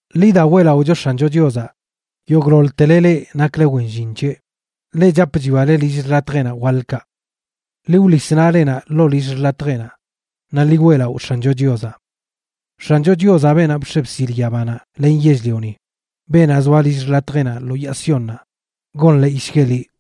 Ḻi da, weꞌlaꞌocho X̱ancho Chiozaꞌ yogꞌḻoḻtele leꞌ nakle wen llin c̱heꞌ, leꞌ chap chwiale lill xḻatjeꞌnaꞌ waḻkaꞌ. Ḻi wḻis naꞌlenaꞌ ḻoo lill xḻatjeꞌnaꞌ naꞌ ḻi weꞌlaꞌo X̱ancho Chiozaꞌ. X̱ancho Chiozaꞌ, beenaꞌ bx̱e bsil yabanaꞌ len yell-lioni, beenaꞌ zoa lill xḻatjeꞌnaꞌ lo yaa Siónnaꞌ, gonḻeeyshgueꞌ liꞌ.